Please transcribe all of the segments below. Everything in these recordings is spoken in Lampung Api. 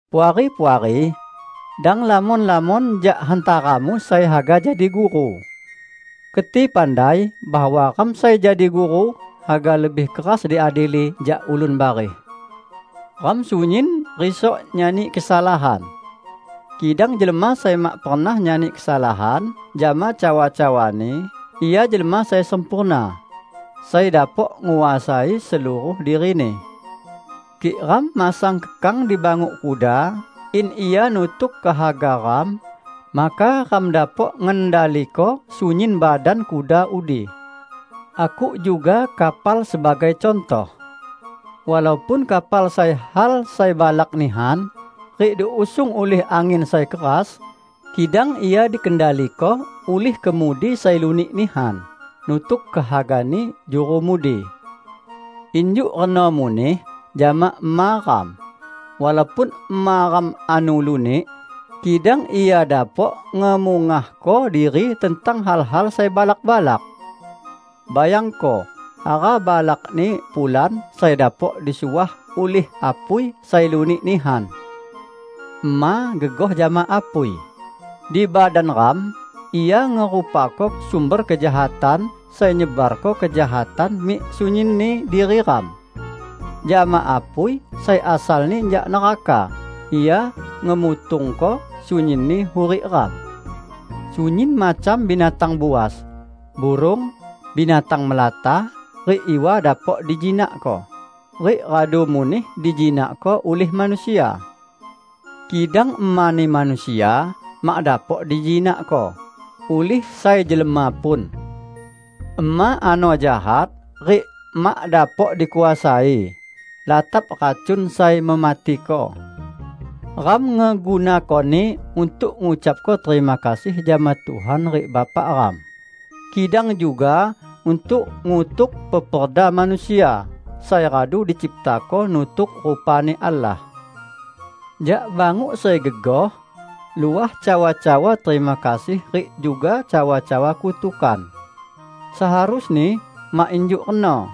Puari-puari! Dang lamon-lamon jak hantaramu sai haga jadi guru. Keti pandai bahwa ram sai jadi guru haga lebih keras diadili jak ulun bareh. Ram sunyin risok nyani kesalahan. Kidang jelma sai mak pernah nyani kesalahan jama cawa-cawani, ia jelma sai sempurna, sai dapok nguasai seluruh dirini. Kik ram masang kekang di banguk kuda in ia nutuk kehaga ram, maka ram dapok ngendaliko sunyin badan kuda udi. Akuk juga kapal sebagai cuntoh. Walaupun kapal sai hal sai balak nihan rik diusung ulih angin sai keras, kidang ia dikendaliko ulih kemudi sai lunik nihan, nutuk kehagani juru mudi. Injuk reno muneh jama ema ram; walaupun ema ram ano lunik, kidang ia dapok ngemungahko diri tentang hal-hal sai balak-balak. Bayangko hara balakni pulan sai dapok disuah ulih apui sai lunik nihan! Ema gegoh jama apui. Di badan ram, ia ngerupako sumber kejahatan sai nyebarko kejahatan mik sunyinni diri ram. Jama apui sai asalni jak neraka, ia ngemutungko sunyinni hurik ram. Sunyin macam binatang buas, burung, binatang melata rik iwa dapok dijinakko, rik radu muneh dijinakko ulih manusia. Kidang emani manusia mak dapok dijinakko ulih sai jelma pun. Ema ano jahat rik mak dapok dikuasai; latap racun sai mematiko. Ram ngegunakoni untuk ngucapko terima kasih jama Tuhan rik Bapa ram, kidang juga untuk ngutuk peperda manusia, sai radu diciptako nutuk rupa-Ni Allah. Jak banguk sai gegoh luah cawa-cawa terima kasih rik juga cawa-cawa kutukan. Seharusni mak injuk reno!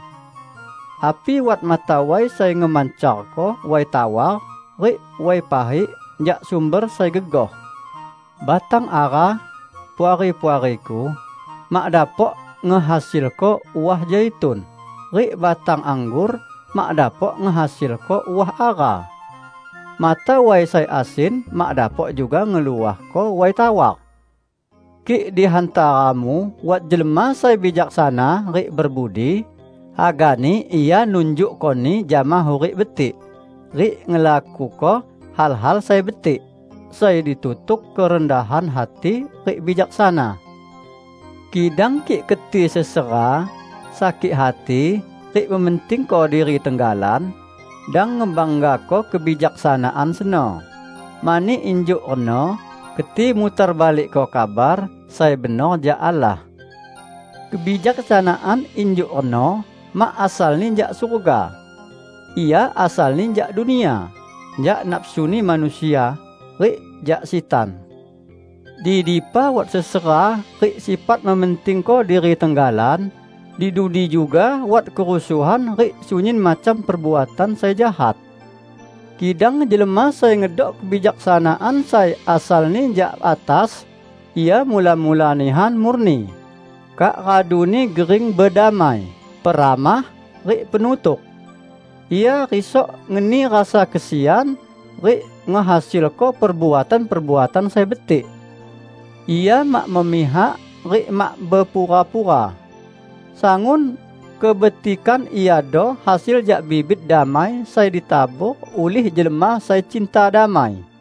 Api wat mata way sai ngemancarko way tawar rik way pahik jak sumber sai gegoh? Batang ara, Puari-puariku, mak dapok ngehasilko uah zaitun, rik batang anggor mak dapok ngehasilko uah ara. Mata way sai asin mak dapok juga ngeluahko way tawar. Kik di hantaramu wat jelma sai bijaksana rik berbudi, hagani ia nunjukkoni jama hurik betik rik ngelakuko hal-hal sai betik, sai ditutuk kerendahan hati rik bijaksana. Kidang kik keti sesera, sakik hati, rik mementingko diri tenggalan, dang ngebanggako kebijaksanaan seno, mani injuk reno keti mutar balikko kabar sai benor jak Allah. Kebijaksanaan injuk reno mak asalni jak surga. Ia asalni jak dunia, jak nafsuni manusia, rik jak sitan! Di dipa wat sesera rik sifat mementingko diri tenggalan, di dudi juga wat kerusuhan rik sunyin macam perbuatan sai jahat. Kidang jelma sai ngedok kebijaksanaan sai asalni jak atas, ia mula-mula nihan murni, kak raduni gering bedamai, peramah, rik penutuk. Ia risok ngeni rasa kesian rik ngehasilko perbuatan-perbuatan sai betik. Ia mak memihak rik mak bepura-pura. Sangun kebetikan iado hasil jak bibit damai sai ditabor ulih jelma sai cinta damai.